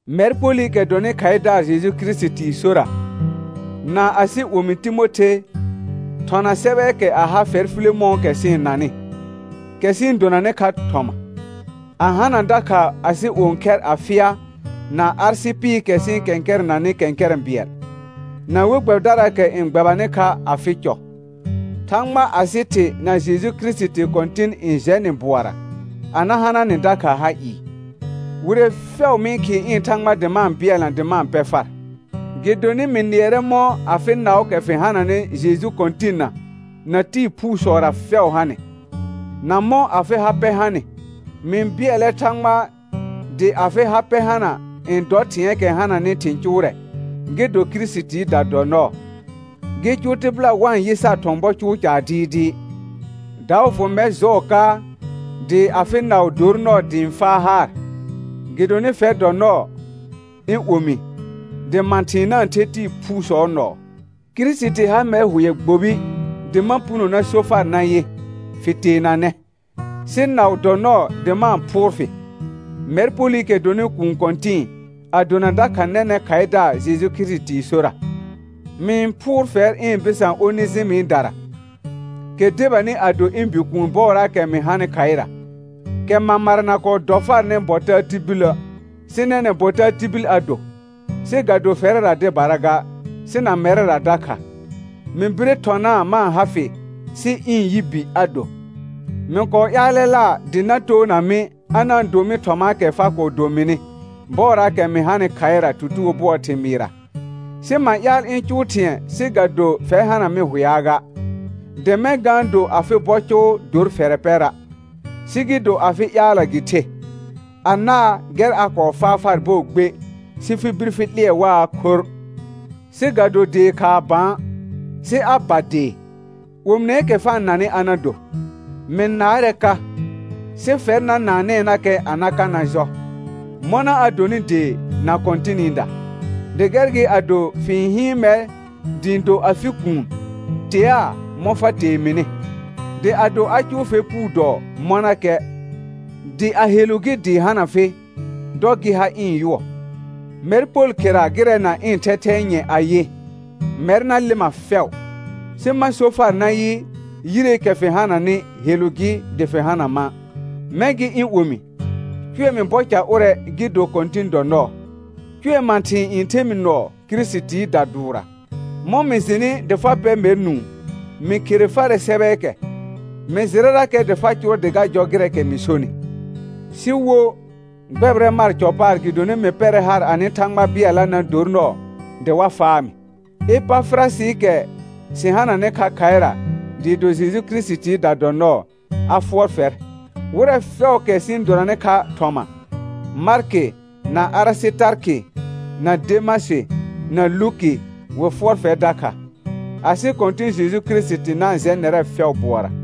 Mɛr Polɩkɛ dɔnɩ khaɩdaar Jeju Kirisitii sora, na asɩ omi Timothe, thɔna sɛbɛɛkɛ a ha fɛr Filemɔ̃ɔkɛ sɩ-n nanɩ, kɛ sɩ-n donanɩ kha thɔma, a hana dakha asɩ õkhɛr Afɩa na Arsɩpɩɩkɛ sɩ-n kɛ̃kɛrɛnanɩ kɛ̃kɛrɛ̃ bɩɛl, na we gbɛbɩdaraakɛ n gbɛbanɩ kha afɩ cɔ. Thãgba asɩ Thɩ na Jeju Kirisiti Kɔ̃tɩn na-n jɛ nɩ bʋɔra a na hana nɩ dakha ha ɩɩ. Wire fɛʋ mɩ-n khɩɩ ɩ̃ Thãgba dɩ ma-n bɩɛlna dɩ ma-n pɛ far, gɩdonɩ mɩ nɩɛrɛ mɔ̃ afɩ naʋʋkɛ fɩ hananɩ Jeju Kɔ̃tɩnna na tɩɩ phuusɔra fɛʋ hanɩ, na mɔ̃ afɩ ha pɛ hanɩ. Mɩ-n bɩɛlɛ Thãgba dɩ afɩ ha pɛ hana n dɔ thɩ̃ɛɛkɛ hananɩ thɩ̃ cʋʋrɛ gɩ do Kirisitiida dɔ nɔɔ, gɩ cʋʋ tɩbɩla wa-n yɩ sar thɔ̃ bɔ cʋʋ caar dɩɩdɩɩ. Daʋ fʋ mɛr jɔɔ ka dɩ afɩ naʋ dor nɔɔ dɩ ɩ̃ faa haar; gɩdonɩ fɛr dɔ nɔɔ, ɩ̃ omi, dɩ mãthɩ̃ɩ na-n the tɩɩ phuusɔɔ nɔɔ. Kirisiti ha mɛr hʋɛ gbobi dɩ ma puno na so far nayɩ: Fɩ teenanɛ; sɩ naʋ dɔ nɔɔ dɩ ma-n phʋʋr fɩ, mɛr Polɩkɛ dɔnɩ kũu kɔ̃tɩ̃ɩ, a dona dakha nɛnɛ̃ khaɩdaar Jeju Kirisitii sora. Mɩ-n phʋʋr fɛr ɩ̃ bɩsã Onejɩmɩdara, kɛ debanɩ a do ɩ̃ bikuun bɔɔraakɛ mɩ hanɩ khaɩra, kɛ mamara na kɔɔ dɔ farnɩ bɔ taa tibilə', sɩ nɛnɛ̃ bɔ taa tibil a do, sɩ ga do fɛrɛra dɩbara ga, sɩ na mɛrɛra dakha. Mɩ bire thɔnaa ma-n ha fɩ sɩ ɩ̃ yi bi a do. Mɩ kɔɔ ƴaalɛla dɩ na toona mɩ a na-n do mɩ thɔmaakɛ fa kɔɔ do mɩnɩ bɔɔraakɛ mɩ hanɩ khaɩra tutugo bʋɔɔ thɩmɩɩra. Sɩ ma ƴaal ɩ̃ cʋʋ thɩ̃ɛ sɩ ga do fɛr hana mɩ hʋɛa ga, dɩ mɛ̃ ga-n do afɩ bɔ cʋʋ dor fɛrɛ pɛra', sɩ gɩ do afɩ ƴaalla gɩ the. Anaa gɛr a kɔɔ faa far bɔɔ gbe, sɩ fɩ bir fɩ 'lɩɛ waa khorr; sɩ ga do dee khaa bã, sɩ a ba dee, omineekɛ fa-n nanɩ a na do. Mɩ naarɛ ka, sɩ fɛr na naanɛɛnakɛ na ka na jɔ, mɔna a donɩ dee na Kɔ̃tɩnɩda. Dɩ gɛr gɩ ado fɩ-n hɩɩn mɛr dɩ ɩ̃ do afɩ kuun, teaa mɔ̃ fa tee mɩnɩ. Dɩ ado a cʋʋ fɛr puu dɔɔ mɔnakɛ, dɩ a helu gɩ dɩ hana fɩ, dɔ gɩ ha ɩ̃ yʋɔ. Mɛr Pol khera gɩrɛ na ɩ̃ thɛthɛɛ nyɛ̃ ayɩ: Mɛr na lɩma fɛʋ. Sɩ ma so far nayɩ, yireekɛ fɩ hananɩ helu gɩ dɩ fɩ hana ma'. Mɛ̃ gɩ ɩ̃ omi, cʋɛ mɩ bɔ ca ʋrɛ gɩ do Kɔ̃tɩn dɔ nɔɔ; cʋɛ mãthɩ̃ɩ n the mɩ nɔɔ Kirisitiida dʋʋrra. Mɔ̃ mɩ jɩnɩ dɩ fa pɛ mɛr nũu mɩ khere farɛ sɛbɛɛkɛ, mɩ jɩrɛrakɛ dɩ fa cʋʋrɛ dɩ ga jɔ gɩrɛɛkɛ mɩ sonɩ. Sɩ wo, gbɛbɩrɛ mar cɔ paar gɩdonɩ mɩ pɛrɛ haar anɩ Thãgba bɩɛlla na dor nɔɔ dɩ wa faa mɩ. Epafɩrasɩɩkɛ sɩ hananɩ kha khaɩra dɩɩ do Jeju Kirisitiida dɔ nɔɔ, a fʋɔr fɛr. Wɩrɛ fɛʋʋkɛ sɩ-n donanɩ kha thɔma, Markɩ na Arɩsɩtarkɩ na Demasɩ na Luki, wɩ fʋɔr fɛr dakha. Asɩ Kɔ̃tɩ̃ Jeju Kirisiti na-n jɛ nɛrɛ fɛʋ bʋɔra.